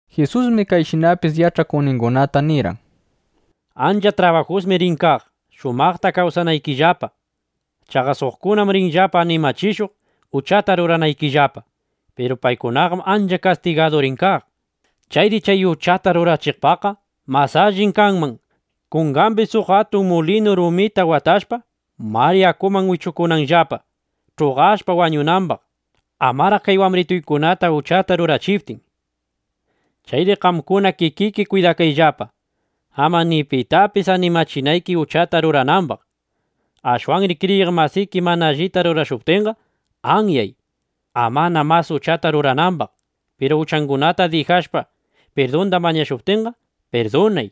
Jisusmi kayshinapis yach'akuqningunata nirqan: —Ancha trabajusmi rin kaq, shumaqta kawsanaykillapa. Chaqa suqkunam rinllapa animachishuq, uchata ruranaykillapa. Piru paykunaqam ancha kastigadu rin kaq. Chayri chay uchata rurachiqpaqqa mas alli kanman kungambi suq atun mulinu rumita watashpa, mar yakuman wichukunanllapa, ch'uqashpa wañunambaq, amaraq kay wambrituykunata uchata rurachiptin. Chayri qamkuna kikiki kwidakayllapa, ama ni pitapis animachinayki uchata ruranambaq. Ashwanri kriyiq masiki mana allita rurashuptinqa, anyay, amana mas uchata ruranambaq. Piru uchangunata dijashpa, pirdunda mañashuptinqa, pirdunay.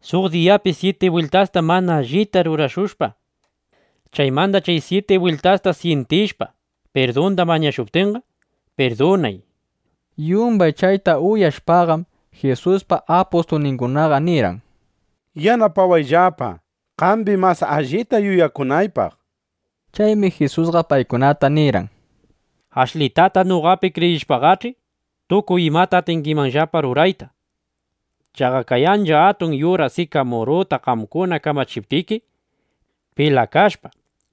Suq diyapi syiti bwiltasta mana allita rurashushpa, chaymanda chay syiti bwiltasta syintishpa, pirdunda mañashuptinqa, pirdunay, nishpa. Yumbay chayta uyashpaqam, Jisuspa apustulningunaqa nirqan: —Yanapawayllapa, qambi mas allita yuyakunaypaq, nishpa. Chaymi Jisusqa paykunata nirqan: —Ashlitata noqapi kriyishpaqach'i, tukuy imata atingimanllapa rurayta. Chaqa kay ancha atun yura sikamuruta qamkuna kamachiptiki: “Pilakashpa,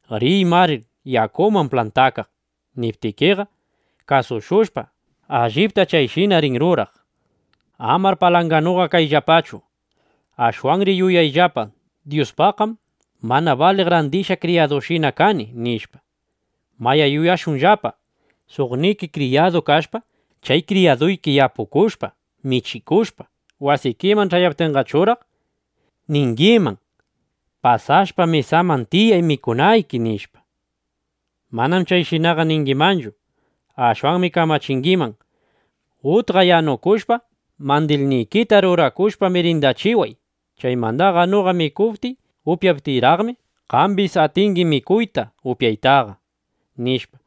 riy mar yakuman plantakaq”, niptikiqa, kasushushpa, allipta chayshina rin ruraq. —Amar palanganuqa kayllapachu. Ashwanri yuyayllapa: Dyuspaqqam mana baliq randishqa kriyadushinalla kani, nishpa. Mayá, yuyashunllapa: Suqniki kriyaduyuq kashpa, chay kriyaduyki yapukushpa, michikushpa, wasikiman ch'ayaptinqachuraq, ¿ningiman: “Pasashpa mesaman tiyay mikunayki”, nishpa? Manam chayshinaqa ningimanchu. Ashwanmi kamachingiman: “Utqa yanukushpa, mandilnikita rurakushpa, mirindachiway. Chaymandaqa noqa mikuptiy upyaptiyraqmi, qambis atingi mikuyta, upyaytaqa”, nishpa.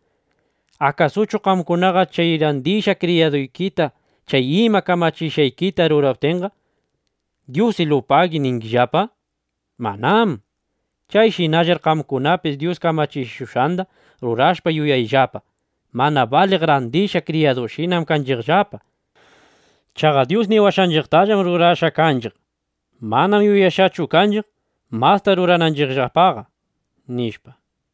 ¿Akasuchu qamkunaqa chay randishqa kriyaduykita chay ima kamachishqaykita ruraptinqa, “Dyusilupagi” ningimanllapa? Manám. Chayshinallar qamkunapis Dyus kamachishushqanda rurashpa, yuyayllapa: “Mana baliq randishqa kriyadushinam kanchiqllapa. Chaqa Dyus niwashqanchiqtallam rurashqa kanchiq. Manam yuyashqachu kanchiq, masta rurananchiqpaqqa”, nishpa.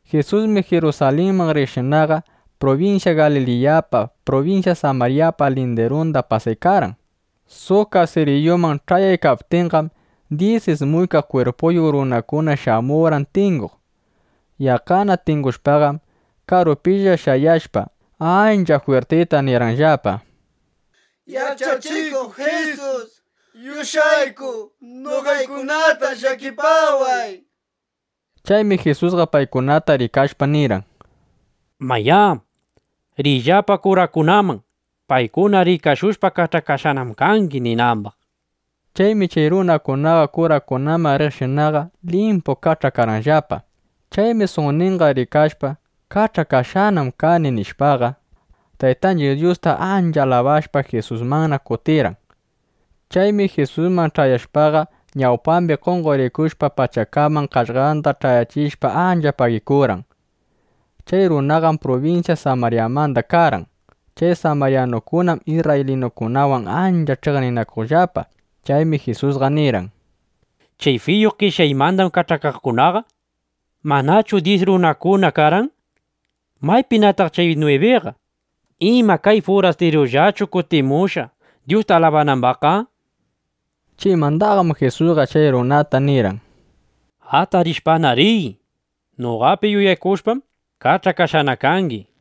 Jisusmi Jirusalinman riqshinaqa, prubinsya Galiliyapa, prubinsya Samaryapa lindirunda pasaykarqan. Suq kasiriyuman ch'ayaykaptinqam, dyis ismuykaq kwirpuyuq runakuna shamurqan tinguq. Yaqqana tingushpaqam, karupilla shayashpa, ancha jwirtita nirqanllapa: —¡Yach'achikuq Jisus, yush'ayku noqaykunatar llakipaway! nishpa. Chaymi Jisusqa paykunata rikashpa, nirqan: —Mayá, riyllapa kurakunaman, paykuna rikashushpa: “Kach'akashqanam kangi”, ninambaq. Chaymi chay runakunaqa kurakunaman riqshinaqa, limpu kach'akarqanllapa. Chaymi suqninqa rikashpa: Kach'akashqanam kani, nishpaqa, Taytanchiq Dyusta ancha alabashpa, Jisusmanna kutirqan. Chaymi Jisusman ch'ayashpaqa, ñawpambi qonqorikushpa, pachakaman qaqllanda ch'ayachishpa, ancha pagikurqan. Chay runaqam prubinsya Samaryamanda karqan. (Chay samaryanukunam isrraylinukunawan ancha ch'iqninakuqllapa.) Chaymi Jisusqa nirqan: —Chay fiyu qeshyaymanda kach'akaqkunaqa ¿manachu dyis runakuna karqan? ¿Maypinataq chay nwibiqa? ¿Ima, kay furastirullachu kutimushqa, Dyusta alabanambaqqa? nishpa. Chaymandaqam Jisusqa chay runata nirqan: —Atarishpana riy. Noqapi yuyakushpam, kach'akashqana kangi, nishpa.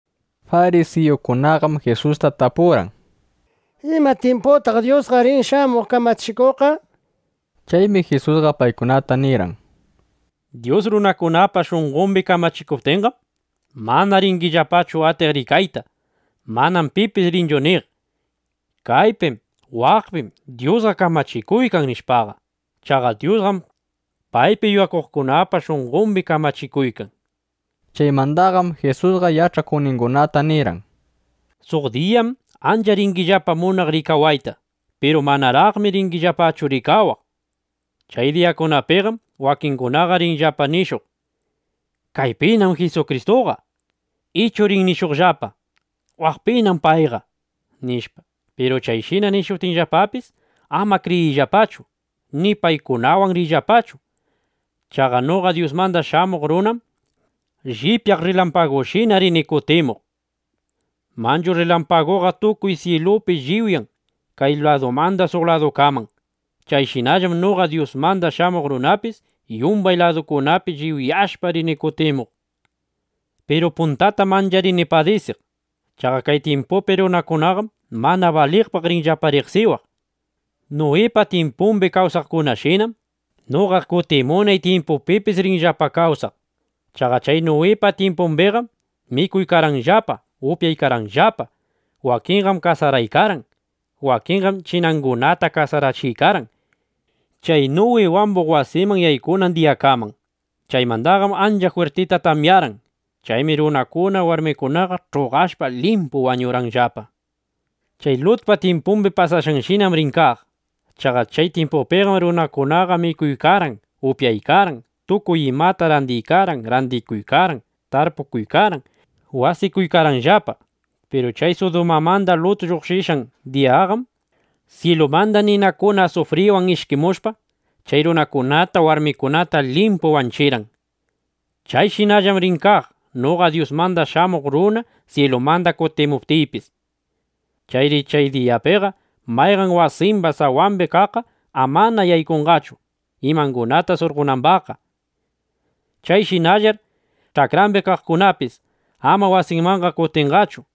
Farisiyukunaqam Jisusta tapurqan: —¿Ima tyimputaq Dyusqa rin shamuq kamachikuqqa? nishpa. Chaymi Jisusqa paykunata nirqan: —Dyus runakunapa shunqombi kamachikuptinqam, mana ringillapachu atiq rikayta. Manam pipis rinchu niq: “Kaypim, waq maypim Dyusqa kamachikuykan”, nishpaqa. Chaqa Dyusqam paypi yuyakuqkunapa shunqombi kamachikuykan, nishpa. Chaymandaqam Jisusqa yach'akuqningunata nirqan: —Suq diyakunam ancha ringillapa munaq rikawayta. Piru manaraqmi ringillapachu rikawaq. Chay diyakunapiqam wakingunaqa rinllapa nishuq: “¡Kaypinam Jisukristuqa!” ichu rin nishuqllapa: “¡Waqpim payqa!” nishpa. Piru chayshina nishuptinllapapis, ama kriyiyllapachu ni paykunawan riyllapachu. Chaqa noqa Dyusmanda Shamuq Runam llipyaq rrilampagushina rini kutimuq. Manchu rrilampaguqa tukuy syilupi lliwyan kay ladumanda suq ladukaman. Chayshinallam noqa Dyusmanda Shamuq Runapis yumbay ladukunapi lliwyashpa, rini kutimuq. Piru puntatam ancha rini padisiq. Chaqa kay tyimpupi runakunaqam mana baliqpaq rinllapa riqsiwaq. ’Nuwipa tyimpumbi kawsaqkunashinam, noqa kutimunay tyimpupipis rinllapa kawsaq. Chaqa chay Nuwipa tyimpumbiqam mikuykarqanllapa, upyaykarqanllapa. Wakinqam kasaraykarqan. ˻Wakinqam chinangunata kasarachiykarqan˼ chay Nuwi wambuq wasinman yaykunan diyakaman. Chaymandaqam ancha jwirtita tamyarqan. Chaymi runakuna warmikunaqa ch'uqashpa, limpu wañurqanllapa. Chay Lutpa tyimpumbi pasashqanshinam rin kaq. Chaqa chay tyimpupiqam runakunaqa mikuykarqan, upyaykarqan, tukuy imata randiykarqan, randikuykarqan, tarpukuykarqan, wasikuykarqanllapa. Piru chay Sudumamanda Lut lluqshishqan diyaqam syilumanda ninakuna asufriwan ishkimushpa, chay runakunata, warmikunata limpu wanchirqan. Chayshinallam rin kaq, noqa Dyusmanda Shamuq Runa syilumanda kutimuptiypis. ’Chayri chay diyapiqa mayqan wasimba sawambi kaqqa amana yaykunqachu, imangunata surqonambaqqa. Chayshinallar ch'akrambi kaqkunapis amana wasinmanqa kutinqachu.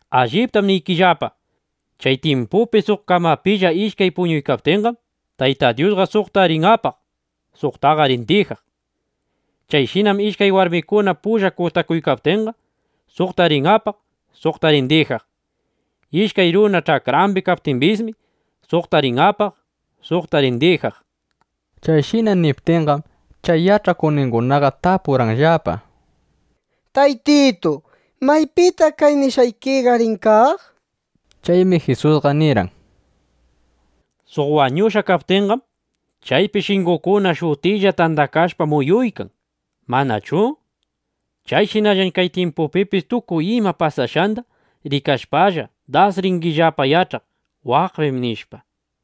’Alliptam niykillapa, chay tyimpupi suq kamapilla ishkay puñuykaptinqam, Tayta Dyusqa suqta rin apaq, suqta rin dijaq. Chayshinam ishkay warmikuna pulla kutakuykaptinqa, suqta rin apaq, suqta rin dijaq. ˻ Ishkay runa ch'akrambi kaykaptimbismi, suqta rin apaq, suqta rin dijaq.˼ Chayshina niptinqam, chay yach'akuqningunaqa tapurqanllapa: —Taytitu, ¿maypitaq kay nishqaykiqa rin kaq? nishpa. Chaymi Jisusqa nirqan: —Suq wañushqa kaptinqam, chaypi shingukuna shutilla tandakashpa muyuykan, ¿manachu? (Chayshinallam chay tyimpupipis tukuy ima pasashqanda rikashpalla, das ringillapa yach'aq: Waqpim, nishpa.)